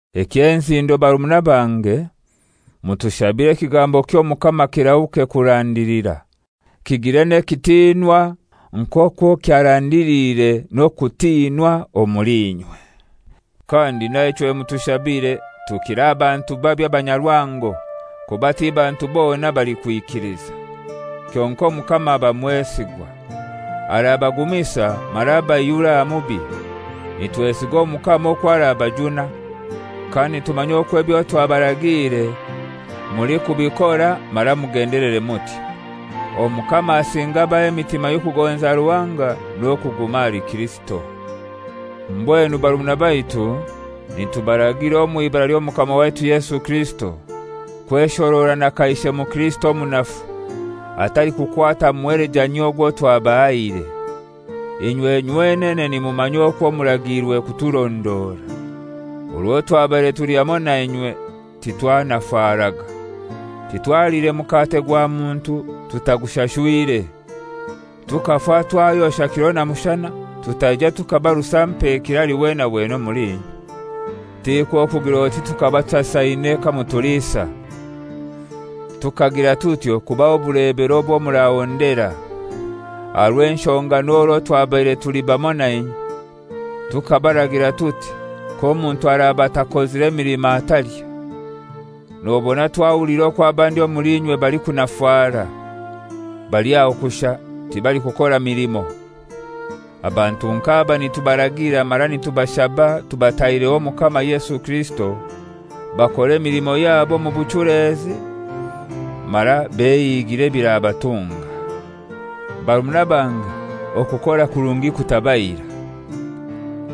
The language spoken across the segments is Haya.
Eky'enzindo barumuna bange, mutushabire ekigambo ky'Omukama kirahuke kurandilira, kigire n'ekitinwa nk'okwo kyarandiliire n'okutinwa omuli inywe. Kandi naichwe mutushabire tukire aha bantu babi abanyarwango, kuba ti bantu bona abalikwikiliza. Kyonkai Omukama aba mwesigwa. Arabagumisa mara abaihure aha mubi. Nitwesiga Omukama okwo arabajuna, kandi nitumanya okwo ebyo twabaragiire mulikubikora mara mugendelere mutyo. Omukama asinge abahe emitima y'okugonza Ruhanga n'okuguma ahali Kirisito. Mbwenu barumuna baitu, nitubaragira omw'ibara ly'Omukama waitu Yesu Kirisito, kweshorora na kaishe mukirisito omunafu, atalikukwata muhelejanyio ogwo twabahaire. Inywe nywenene nimumanya okwo muragiirwe kuturondora. Orwo twabaire tuli hamoi nainywe titwanafaraga. Titwaliire mukate gwa muntu tutagushashwire. Tukafa twayosha kiro na mushana, tutaija tukaba rusampekire ahali wena wena omuli inywe. Tikwo kugir'oti tukaba tutasaine kamutuliisa. Tukagira tutyo kubaha obulebero obwo murahondera. Aha rw'enshonga n'orwo twabaire tuli bamoi nainywe, tukabaragira tuti: K'omuntu araba atakozire milimo, atalya. Nobona twahuliire okwo abandi omuli inywe balikunafara, bali aho kushai, tibalikukora milimo. Abantu nk'aba nitubaragira mara nitubashaba tubataireho Omukama Yesu Kirisito bakore emilimo yabo omu buchulezi mara behigire ebirabatunga. Barumuna bange, okukora kurungi kutabaira.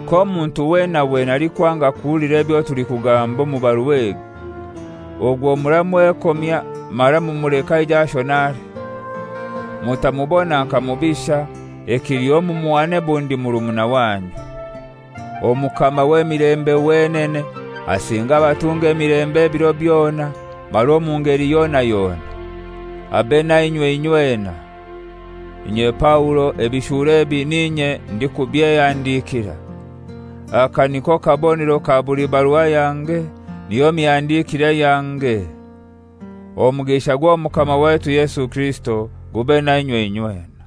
K'omuntu wena wena alikwanga kuhulira ebyo tulikugamba omu barua egi, ogwo muramwekomya mara mumuleke aije ashonare. Mutamubona nka mubisha, ekiliho mumuhane bundi murumuna wanyu. Omukama w'emilembe wenene asinge abatunge emilembe ebiro byona mara omu ngeli yona yona. Abe nainywe inywena. Inye Paulo, ebishuuro ebi n'inye ndikubyehandikira. Aka niko kabonero ka buli barua yange, niyo mihandikire yange. Omugisha gw'Omukama waitu Yesu Kirisito gube nainywe inywena.